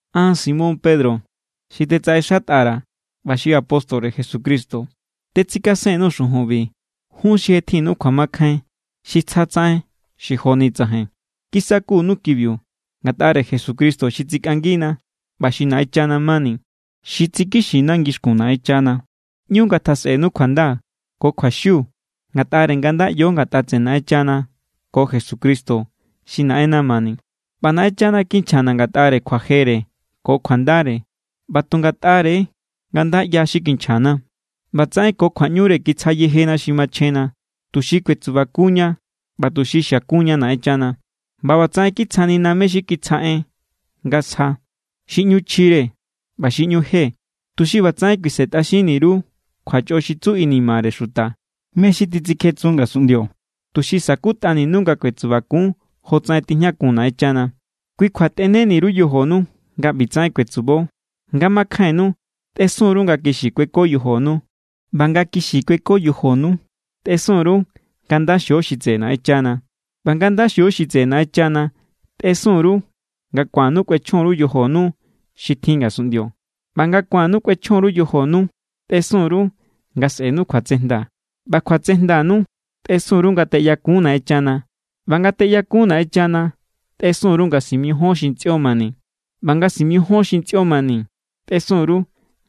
An, Simón Pedro, xi tetsaꞌexatꞌa_ra̱ ꞌba xi apóstore Jesucristo, tetsikasen_nuu̱ xujunbi jun xi je tjinnu kjuamakjain xi tsjatsaꞌen xi joni tsajain. Kisakunnu kibiu ngatꞌare Jesucristo xi tsikꞌangina ꞌba xi Naꞌenchana= mani. Xi tsikixina ngixkun Naꞌenchana. ꞌÑu ngatjasꞌenu kjuanda ko kjuaxiu ngatꞌare nga nda ꞌyo ngatꞌa tseꞌe Naꞌenchana ko Jesucristo xi Naꞌenna mani. ꞌBa Naꞌenchana kinchjana̱ ngatꞌare kjuajere ko kjuandare. ꞌBa tu ngatꞌare= nga nda ꞌya xi kinchjana̱, ꞌbatsaꞌen ko kjuaꞌñure kitsja yejena xi machjenna, tuxi kuetsubakunña ꞌba tuxi xiakunña Naꞌenchana. ꞌBa ꞌbatsaꞌen kitsjanina mé= xi kitsja en nga sja, xi ꞌñu chjire ꞌba xi ꞌñu je, tuxi ꞌbatsaꞌen kuisentꞌaxinni_ru kjuachꞌo xi tsu inimare xuta, mé= xi titsikjetsun ngasunꞌndio, tuxi sa̱kutꞌaninu nga kuetsubakun jotsaꞌen tijñakun Naꞌenchana. Kui kjua tꞌeneni_ru yojonu nga ꞌbitsaꞌen kuetsubo. Nga makjainnu tꞌesun_ru nga kixi kueko yojonu. ꞌBa nga kixi kueko yojonu tꞌesun_ru nga nda xio xi tseꞌe Naꞌenchana. ꞌBa nga nda xio xi tseꞌe Naꞌenchana tꞌesun_ru nga ku̱annu kꞌuechjon_ru yojonu xi tjin ngasunꞌndio. ꞌBa nga ku̱annu kꞌuechjon_ru yojonu tꞌesun_ru nga sꞌe̱nu kjuatsejnda. ꞌBa kjuatsejndanu tꞌesun_ru nga teꞌyakun Naꞌenchana. ꞌBa nga teꞌyakun Naꞌenchana tꞌesun_ru nga simijíon xi ntsꞌio mani. ꞌBa nga simijíon xi ntsꞌio mani tꞌesun_ru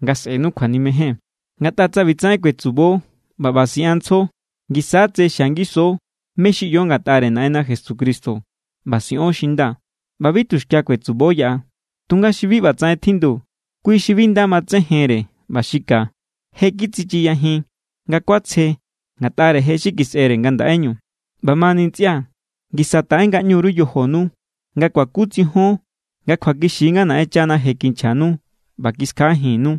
nga sꞌe̱nu kjuanimejen. Ngatꞌa tsa ꞌbitsaꞌen kuetsubo ꞌba ꞌba siꞌanntsjo, ngisa= tse xia ngiso mé= xi ꞌyo ngatꞌare Naꞌenna Jesucristo ꞌba siꞌon xi nda. ꞌBa bi tuxkia kuetsubo yaꞌa. Tunga xi bi ꞌbatsaꞌen tjindu, kui xi bi nda matsejenre ꞌba xi ka. Je= kitsichiyajin nga kuatsje ngatꞌare je xi kisꞌere nga ndaꞌeñu. ꞌBamani ntsꞌia̱, ngisa taꞌe ngaꞌñu_ru yojonu nga kuakutsijion nga kjuakixi= nga Naꞌenchana je kinchjanu ꞌba kiskjaꞌajinnú.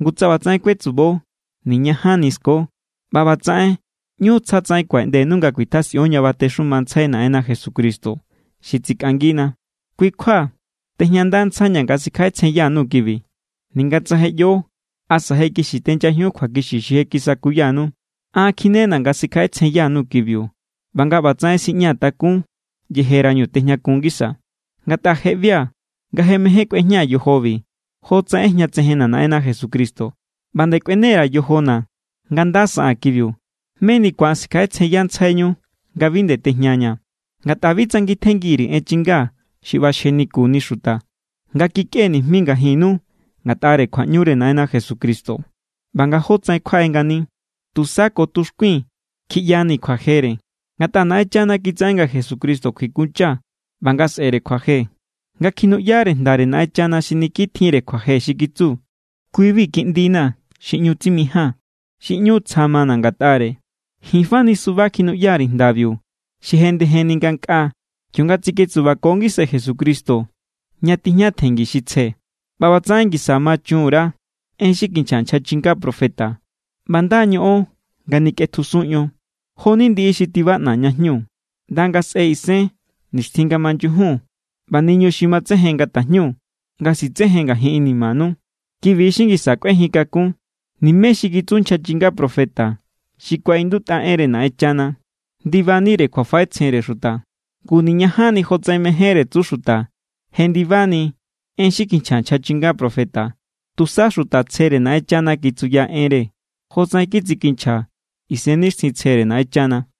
Ngu tsa ꞌbatsaꞌen kuetsubo, niñajanni sko. ꞌBa ꞌbatsaꞌen ꞌñu tsjatsaꞌen kuaꞌeꞌndenu nga kuitjasꞌion ña batexumantsjai Naꞌenna Jesucristo xi tsikꞌangina. Kui= kjua tejñandantsjaiña̱ nga sikjaꞌetsjenyanu kibi, ninga tsa je ꞌyo asa je kixi tenyajiun kjuakixi xi je kisakuyanu. An kjinena̱ nga sikjaꞌetsjenyanu kibiu ꞌba nga ꞌbatsaꞌen siꞌñaa̱ takún, yejerañu tejñakun ngisaa̱. Ngatꞌa je ꞌbia̱ nga je mején kꞌuejñaa̱ yojobi, jotsaꞌen ꞌejñatsejenna̱ Naꞌenna Jesucristo. ꞌBa nde kꞌuene_ra̱ yojona̱ nga nda saꞌaa̱n kibiu, meni ku̱an sikjaꞌetsjenyantsjaiñu nga bi nde tejñaña̱. Ngatꞌa bi tsangitjengi_ri̱ en chinga xi ꞌbaxjenikuni xuta, nga kikꞌee̱ nijmi ngajinnu ngatꞌare kjuaꞌñure Naꞌenna Jesucristo= ꞌba nga jótsaꞌen kjuaꞌe ngani. Tusa ko tuxkuii̱n kjiꞌyani̱ kjuajere. Ngatꞌa Naꞌenchana kitsaꞌen nga Jesucristo kjuikuncha ꞌba nga sꞌe̱re kjuaje, nga kjinuꞌyare jndare Naꞌenchana xi niki tjinre kjuaje xi kitsu: “Kui=bi Kiꞌndina̱ xi ꞌñu tsimijaa̱n xi ꞌñu tsja mana̱ ngatꞌare.” Ji̱n fani suba kjinuꞌya_ri̱ jndabiu xi jenndejenni ngankꞌaa, kionga tsiketsubako ngisai Jesucristo ña tijña tjenngi xi tsje. ꞌBa ꞌbatsaꞌen ngisa ma chun_ra en xi kinchja nchja chinga profeta. ꞌBa nda= ñoꞌon nga nikꞌetjusun ion. Jo=ni ndiꞌi xi tibaꞌna̱ ña jñu, ꞌnda nga sꞌe̱ isen nixtjin nga manyujun ꞌba niñu xi matsejen nga tajñu nga sitsejen ngajin inimanu. Kibi= xi ngisa kꞌuejin kakun. Nimé xi kitsu nchja chinga profeta, xi kuaꞌindutꞌa enre Naꞌenchana, ndibanire kjuafaꞌetsjenre xuta. Ngu niñajanni jotsaꞌen mejénre tsu xuta jendibani en xi kinchja nchja chinga profeta. Tusa xuta tsjere Naꞌenchana kitsuya enre, jotsaꞌen kitsikinchja Isennixtjintsjere Naꞌenchana.